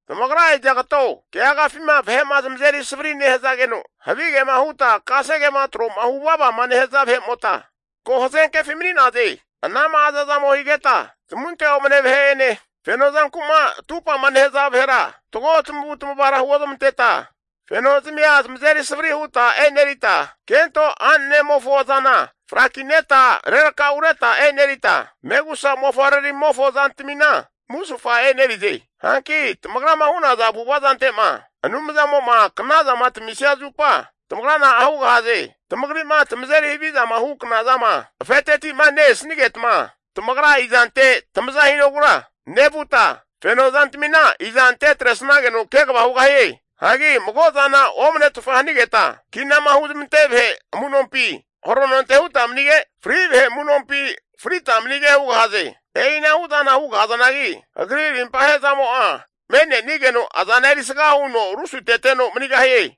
Tamagra izagato keagafima vahe'ma zamazeri savri nehuta havigema huta kasegema tro'ma hu vavama nehaza vahe'mota ko hazenkefi mani'naze. Anama hazazamo higeta zamunte omne vahe'ene, feno zanku'ma atupa'ma nehaza vahera fatgo tamavu'tamavara huozmanteta fenozmia zamazeri savri huta e'nerita, kento a'nanemofo zana frakineta rerakaureta e'nerita, megusa mofavre'ramimofo zantamina musufa e'nerize. Hanki tamagrama hu'naza avu'avazante'ma Anumzamo'ma knazama tamisia zupa tamagra na'a hugahaze? Tamagri'ma tamazeri havizama hu knazama afeteti'ma ne-esnigetma, tamagra izante tamaza hinogura nevuta, feno zantamina izante atresnageno kegava hugahie? Hagi mago'zana omnetfa hanigeta kinama huzmante'nesaza vahe amu'nompi harononte huta manige, fri vahe amu'nompi frita manige hugahaze. E'ina hu'zana hugahazanagi Agri rimpa ahe'zamo'a me'nenigeno azana erisga huno rusuteteno manigahie.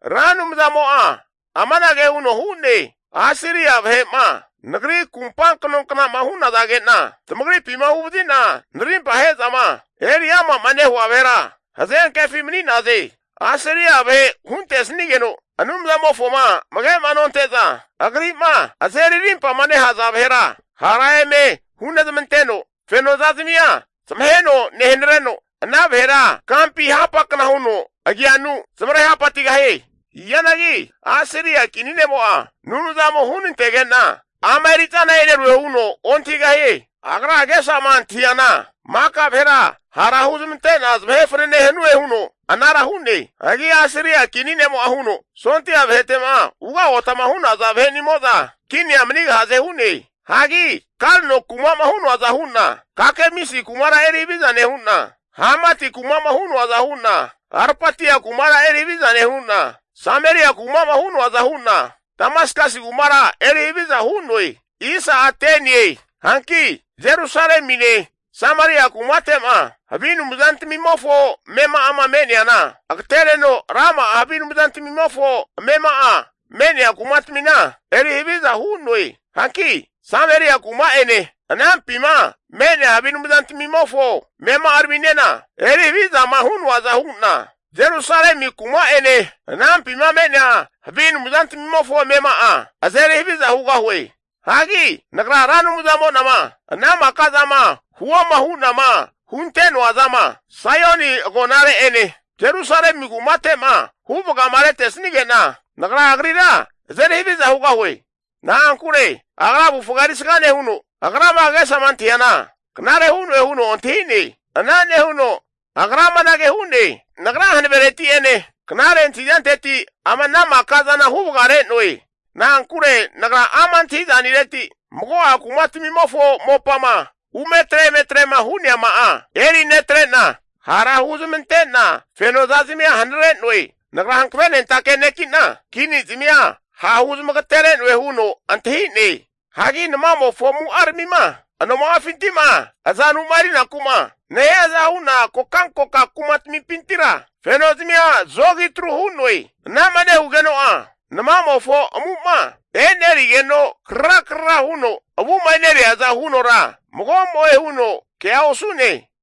Ra Anumzamo'a amanage huno hu'ne, Asiria vahe'ma Nagri kumpa knonknama hu'nazage'na tamagripima huvazina narimpa ahe'zama eri amama nehua vahera hazenkefi mani'naze. Asiria vahe huntesnigeno Anumzamofoma amage'ma nonte'za agri'ma azeri arimpama nehaza vahera hara eme hunezmanteno, feno zazamia zamaheno nehanareno ana vahera kampi hapakna huno agianu zamare hapatigahie. Hianagi Asiria kini ne'mo'a Anumzamo hunantegena ama eri'zana e'nerue huno ontahigahie. Agra agesama antahiana maka vahera hara huzmante'na zamahe fanane hanue huno anara hu'ne. Hagi Asiria kini ne'mo'a huno, sondia vahete'ma ugagotama hu'naza vahenimoza kinia manigahaze hu'ne. Hagi Kalno kuma'ma hu'noaza hu'na Kakemisi kumara eri haviza nehu'na, Hamati kuma'ma hu'noaza hu'na, Arpatia kumara erihaviza nehu'na, Sameria kuma'ma hu'noaza hu'na, Damaskasi kumara eri haviza hu'noe. Hanki Jerusalemine Sameria kumate'ma havi anumzantamimofo amema'ama me'neana agatereno rama'a havi anumzantamimofo amema'a me'nea kumatamina eri haviza hu'noe. Hanki Sameria kuma'ene anampima me'nea havi anumzantamimofo amema'araminena eri havizama hu'noaza hu'na, Jerusalemi kuma'ene anampima me'nea havi anumzantamofo amema'a eri haviza hugahue. Hagi Nagra Ra Anumzamo'nama ana maka'zama huoma hu'nama hunte'noa zama Saioni agonare'ene Jerusalemi kumate'ma huvagama retesnige'na, Nagra agrira azeri haviza hugahue. Na'ankure agra avufga erisga nehuno, agrama agesama antahiana knare hu'noe huno antahi'ne. Ana nehuno agra amanage hu'ne, Nagra hanavereti'ene knare antahizanteti ama ana maka zana huvagare'noe. Na'ankure nagra ama' antahi'zanireti, mago'a kumatmimofo mopama umetre emetrema hu'neama'a, eri netre'na hara huzmante'na fenozazmia hanare'noe. Nagra hankavenentake neki'na, kini zamia ha' huzamagatere'noe huno antahi'ne. Hagi namamofo amu'aramima anoma'afintima azanuma erinaku'ma nehiaza hu'na kokankoka kumatamimpintira fenozmia zogi tru hu'noe. Anama nehugeno'a namamofo amu'ma e'nerigeno krara krara huno avuma e'neriaza hunora mago'mo'e huno kea osu'ne.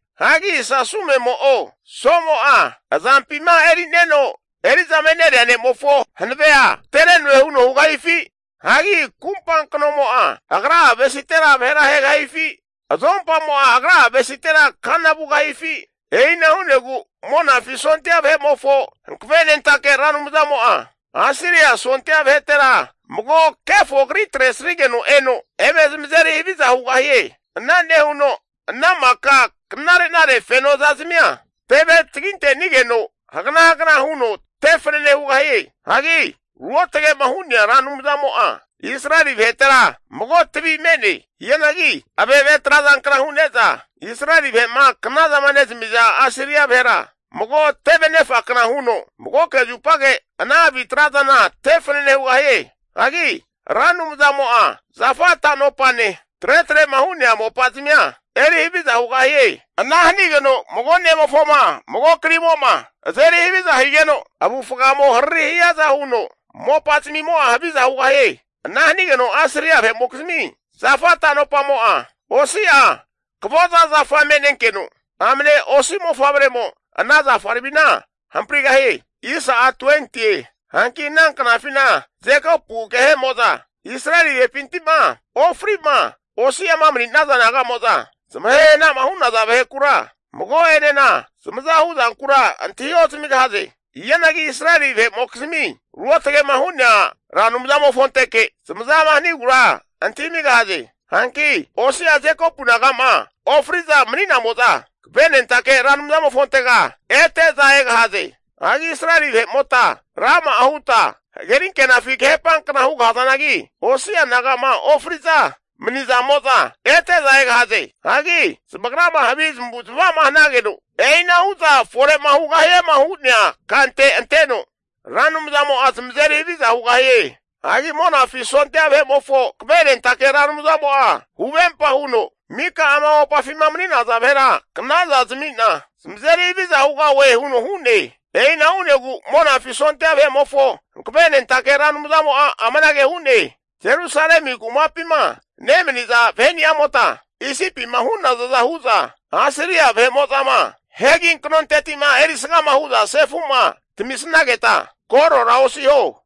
Hagi sasumemo'o somo'a azampima erineno eri'zama eneria nemofo hanavea agatere'noe huno hugahifi? Hagi kumpa knomo'a, agra'a avesitera vahera ahegahieo? Azompamo'a agra'a avesitera kana vugahifi? E'ina hu'negu Monafi sondia vahe'mofo Hankavenentake Ra Anumzamo'a Asiria sondia vahetera mago kefo kri atresigeno eno eme zamazeri haviza hugahie. Ana nehuno ana maka knarenare feno zazamia teve taginte'nigeno hagna hagna huno tefanane hugahie. Hagi ruotage'ma hu'nea Ra Anumzamo'a, Israeli vahetera mago tavi mani'ne. Hianagi ave'ave trazankna hu'neza Israeli vahe'ma knazama nezamiza Asiria vahera, mago teve anefa kna huno magoke zupage ana havi trazana tefanane hugahie. Hagi Ra Anumzamo'a zafa tano'pane tretrema hu'nea mopazmia eri haviza hugahie. Ana hanigeno mago ne'mofoma mago krimo'ma azeri haviza higeno, avufgamo hariri hiaza huno mopazmimo'a haviza hugahie. Ana hanigeno Asiria vahe'mokizmi zafa tanopamo'a, osi'a akavoza zafa me'nenkeno, amne osi mofavremo ana zafaramina hamprigahie. Hanki ana knafina Jekopu agehemo'za Israeli vahepinti'ma ofri'ma osi'ama mani'naza naga'mo'za, zamahe hana'ma hu'naza vahekura mago'enena zamaza hu'zankura antahi ozamigahaze. Hianagi Israeli vahe'mokizmi ruotge'ma hu'nea Ra Anumzamofonteke zamazama hanigura antahimigahaze. Hanki osi'a Jekopu naga'ma ofri'za mani'namo'za, Hankavenentake Ra Anumzamofontega ete'za egahaze. Hagi Israeli vahe'mota rama'a huta hagerinkenafi kahepankna hu'nazanagi, osi'a naga'ma ofri'za mani'zamo'za ete'za egahaze. Hagi zamagrama havi zamavu'zamavama hanageno e'inahu'za fore'ma hugahiema hu'nea kante anteno, Ra Anumzamo'a zamazeri haviza hugahie. Hagi Monafi sondia vahe'mofo Hankavenentake Ra Anumzamo'a huvempa huno, mika ama mopafima mani'naza vahera knaza zami'na zamazeri haviza hugahue huno hu'ne. E'ina hu'negu Monafi sondia vahe'mofo Hankavenentake Ra Anumzamo'a amanage hu'ne, Jerusalemi kumapima nemaniza vahe'ni'amota, Isipima hu'nazaza hu'za, Asiria vahe'mo'zama hegi kanonteti'ma erisgama hu'za sefu'ma tamisnageta korora osiho.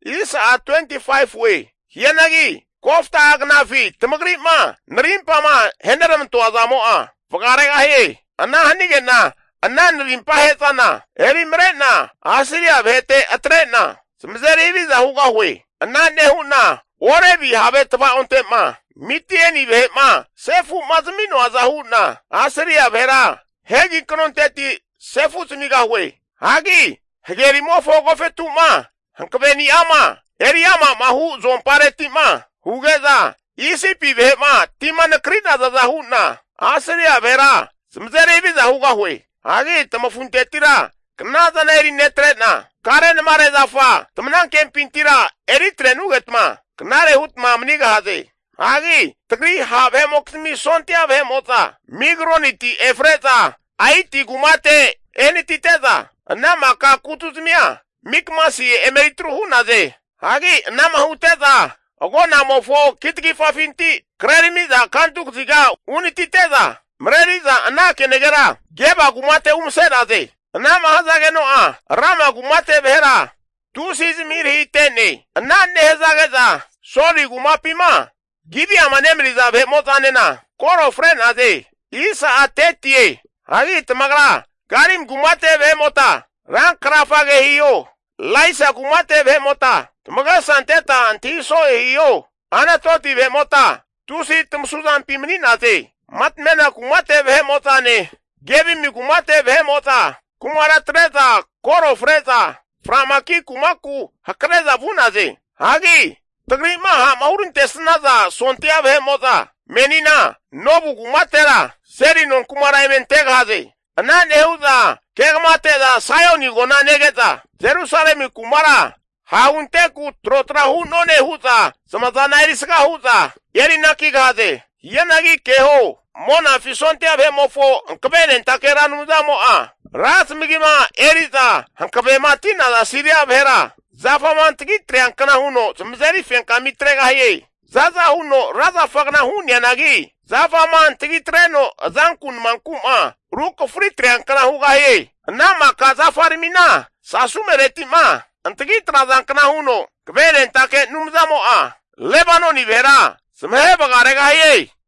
Hianagi kofta'a knafi tamagri'ma narimpama aheneramantoa zamo'a vagaregahie. Ana hanige'na ana narimpa ahe'zana erimare'na Asiria vahete atre'na zamazeri haviza hugahue. Ana nehu'na Orebi have tvaonte'ma Midieni vahe'ma sefu'ma zami'noaza hu'na, Asiria vahera hegi kanonteti sefu zamigahue. Hagi hagerimofo agofetu'ma hankaveni'ama eri amama hu azomparetima huge'za Isipi vahe'ma tima nakri'nazaza hu'na Asiria vahera zamazeri huviza hugahue. Hagi tamafuntetira knazana eri netrena, karenamare zafa tamanankempintira eritrenugetma knare hutma manigahaze. Hagi tagri ha' vahe'mokizmi sondia vahe'mo'za Migroniti efre'za Aiti kumate ehanatite'za, ana maka kutuzmia Mikmasi emeri atru hu'naze. Hagi anama hute'za agonamofo kitagifafinti kreramiza kantu kaziga uhanatite'za, mareri'za ana kenagera Geba kumate umase'naze. Anama hazageno'a Rama kumate vahera tusi zamahirahite'ne. Ana nehazage'za Soli kumapima Gibiama nemaniza vahe'mo'zanena koro fre'naze. Hagi tamagra Galimi kumate vahe'mota rankrafage hiho, Laisa kumate vahe'mota tamagesa anteta antahi so'e hiho, Anatoti vahe'mota tusi tamasu zampi mani'naze. Matmena kumate vahe'mo'zane, Gebimi kumate vahe'mo'za kumara atre'za koro fre'za fra'maki kumaku hakre'za vu'naze. Hagi tagri'ma ha'ma hurantesnaza sondia vahe'mo'za menina Nobu kumatera seli nonkumara eme antegahaze. Ana nehu'za kegamate'za Saioni agona nege'za, Jerusalemi kumara ha'hunteku trotra hu'none hu'za zamazana erisga hu'za erinakigahaze. Hianagi keho, Monafi sondia vahe'mofo Hankavenentake Ra Anumzamo'a, ra zamagima eri'za hakavemati'naza Siria vahera zafama antagi atreankna huno zamazeri fenkami atregahie. Za'za huno ra zafagna hu'neanagi, zafama antagi atreno azanku namanku'ma rukafari atreankna hugahie. Ana maka zafaramina saumeretima antagi atrazankna huno Hankavenentake Anumzamo'a Lebanoni vahera zamahe vagaregahie.